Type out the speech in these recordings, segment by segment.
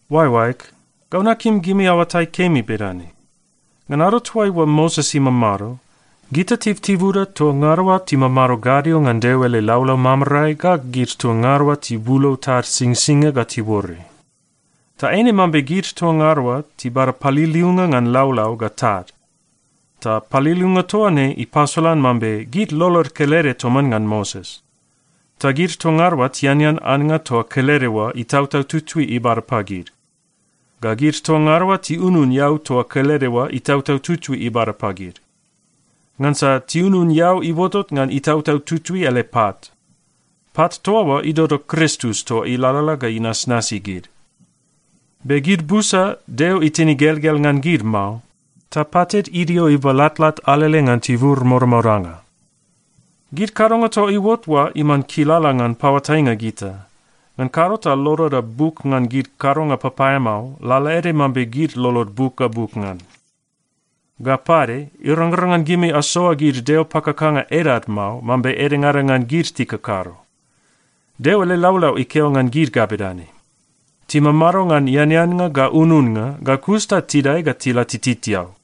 Oaeoaeg, gau nakim gimi aoatai kemi bedane: Ngan ado toaiua Moses imamado, gita tibutibuda toa ngada oa timamado gadio ngan Deo ele laulau mamarae ga gid toa ngada oa tibulou tad Singsingia ga tiuore. Ta eine mambe gid toa ngada oa tibada paliliunga ngan laulau ga tad, ta paliliunga toa ne ipasolan mambe gid lolod kelede toman ngan Moses. Ta gid toa ngada oa tianean annga toa kelede oa Itautau Tutui ibada pagid. Ga gid toa ngada oa tiunun eau toa kelede oa Itautau Tutui ibada pagid. Ngansa tiunun eau iuotot ngan Itautau Tutui ele pat. Pat toa oa idodo Kristus toa ilalala ga inasnasi gid. Be gid busa, Deo itin igelgel ngan gid mao, ta patid idio ibalatlat alele ngan tibur modamodanga. Gid kadonga toa iuot oa iman kilala ngan paoatainga gita. Ngan kado ta loloda buk ngan gid kadonga papaeamao lalaede mambe gid lolod buk ga buk ngan. Ga pade, irangrang ngan gimi asoa gid deo pakakanga edad mao, mambe edengada ngan gid tikakado. Deo ele laulau ikeo ngan gid ga bedane, “Timamado ngan eaneannga ga ununnga, ga kus ta tidae ga tila tititiau.”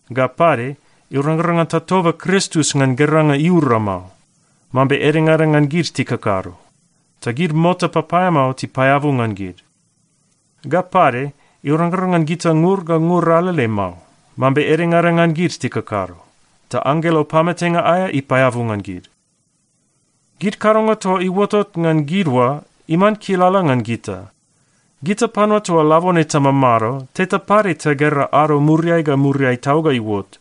Ga pade, irangrang ngan tatoba Kristus ngan geranga iura mao, mambe edengada ngan gid tikakado. Ta gid mota papaeamao tipaeabu ngan gid. Ga pade, irangrang ngan gita ngur ga ngur alele mao, mambe edengada ngan gid tikakado. Ta anggelo pamatenga aea ipaeabu ngan gid. Gid kadonga toa iuotot ngan gid oa iman kilala ngan gita. Gita panua toa labone tamamado, teta pade tagera ado muriai ga muriai tau ga iuot.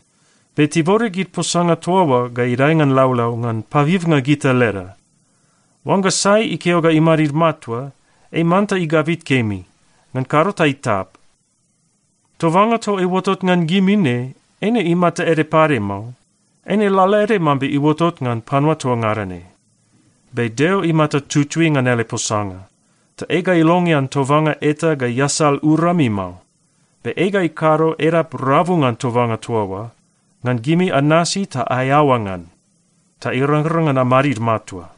Be tibode gid posanga toa oa ga idae ngan laulau ngan pabibnga gita leda. Oangga sai ikeo ga imadid matua, ei manta igabit kemi, ngan kado ta itap. Tobanga toa iuotot ngan gimi ne, eine imata ede pade mao. Eine lalaede mambe iuotot ngan panua toa ngada ne. Be Deo imata tutui ngan ele posanga, ta ei ga ilongean tobanga eta ga iasal urami mao. Be ei ga ikado edap rabu ngan tobanga toa oa, ngan gimi anasi ta aeaoa ngan, ta irangrang ngan amadid matua.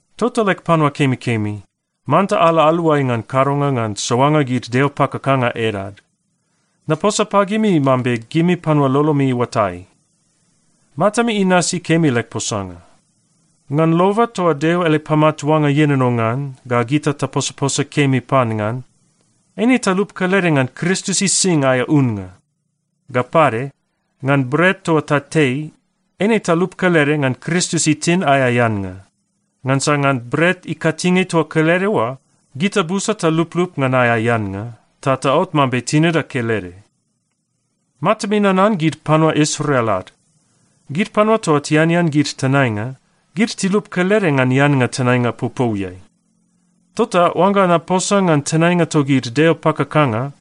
Tota leg panua kemikemi, manta ala aluai ngan kadonga ngan soanga gid deo pakakanga edad. Naposa pagimi mambe gimi panua lolomi iuatai. Matami inasi kemi leg posanga. Ngan loba toa Deo ele pamatuanga ienono ngan ga gita taposaposa kemi pan ngan, eine talup kelede ngan Kristus ising aea unnga. Ga pade, ngan bret toa tatei, eine talup kelede ngan Kristus itin aea eannga. Ngansa ngan bret ikatinge toa kelede oa, gita busa taluplup ngan aea eannga, ta taot mambe tinida kelede. Matami nanan gid panua Israel ad. Gid panua toa tianean gid tenainga, gid tilup kelede ngan eannga tenainga popouiai. Tota oangga naposa ngan tenainga togid deo pakakanga,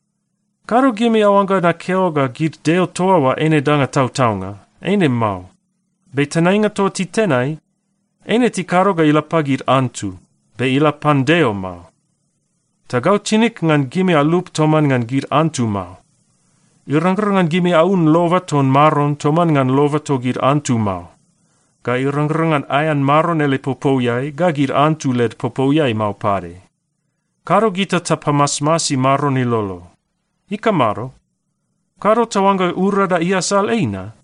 kado gimi aoangga nakeo ga gid deo toa oa eine danga tautaunga. Eine mao. Be tenainga toa titenai, eine tikado ga ila pagid antu, be ila pan Deo mao. Ta gau tinig ngan gimi alup toman ngan gid antu mao. Irangrang ngan gimi aun loba ton Maron toman ngan loba togid antu mao. Ga irangrang ngan aean Maron ele popouiai ga gid antu led popouiai mao pade. Kado gita tapamasmasi Maron ilolo. Ikamado? Kado taoangga urada iasal ei na?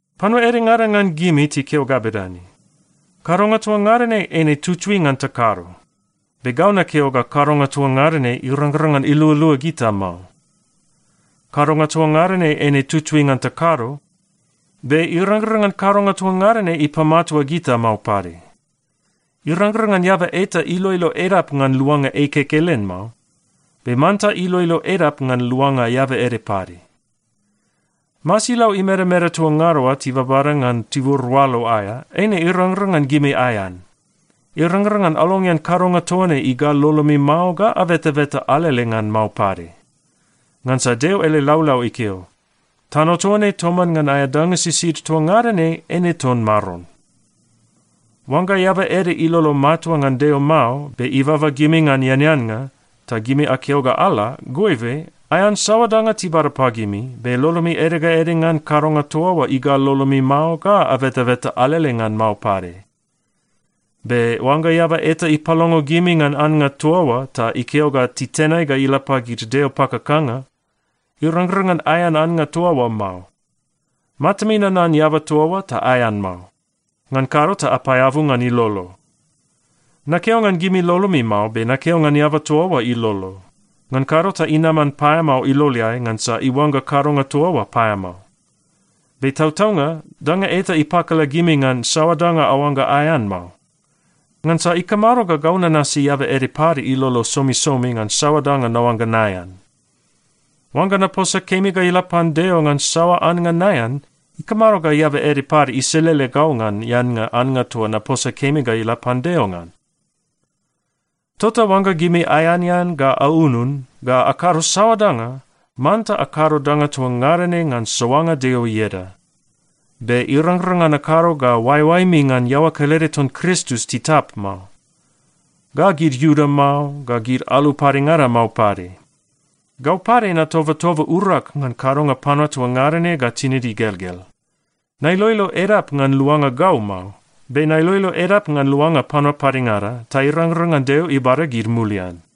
Panua edengada ngan gimi tikeo ga bedane, “Kadonga toa ngada ne eine tutui ngan takado,” be gau nakeo ga kadonga toa ngada ne irangrang ngan ilualua gita mao. “Kadonga toa ngada ne eine tutui ngan takado,” be irangrang ngan kadonga toa ngada ne ipamatua gita mao pade. Irangrang ngan eaba eta iloilo edap ngan luanga ei kekelen mao, be manta iloilo edap ngan luanga eaba ede pade. Masilau imedameda toa ngada oa tibabada ngan tibur oalo aea, eine irangrang ngan gimi aean. Irangrang ngan alongean kadonga toa ne igal lolomi mao ga abetabeta alele ngan mao pade. Ngansa Deo ele laulau ikeo, “Tano toa ne toman ngan aea danga sisid toa ngada ne eine ton Maron.” Oangga eaba ede ilolo matua ngan Deo mao, be ibaba gimi ngan eaneannga, ta gimi akeo ga ala, goibe, aean saoa danga tibada pagimi, be lolomi ede ga ede ngan kadonga toa oa igal lolomi mao, ga abetabeta alele ngan mao pade. Be oangga eaba eta ipalongo gimi ngan annga toa oa ta ikeo ga titenai ga ila pagid deo pakakanga, irangrang ngan aean annga toa oa mao. Matami nanan eaba toa oa, ta aean mao. Ngan kado ta apaeabu ngan ilolo. Nakeo ngan gimi lolomi mao, be ngan eaba toa oa ilolo, ngan kado ta inaman paeamao iloleai ngansa iuangga kadonga toa oa paeamao. Be tautaunga danga eta ipakala gimi ngan saoa danga aoangga aean mao. Ngansa ikamado ga gau nanasi eaba ede pade ilolo somisomi ngan saoa danga naoangga naean? Oangga naposa kemi ga ila pan Deo ngan saoa annga naean, ikamado ga eaba ede pade iselele gau ngan eannga annga toa naposa kemi ga ila pan Deo ngan? Tota oangga gimi aeanean ga aunun, ga akado saoa danga, manta akado danga toa ngada ne ngan soanga Deo ieda. Be irangrang ngan akado ga oaeoaemi ngan iaoa kelede ton Kristus titap mao, ga gid Iuda mao, ga gid alu padengada mao pade. Gau pade natobatoba urag ngan kadonga panua toa ngada ne ga tinid igelgel. Nailoilo edap ngan luanga gau mao, be nailoilo edap ngan luanga panua padengada, ta irangrang ngan Deo ibada gid mulian.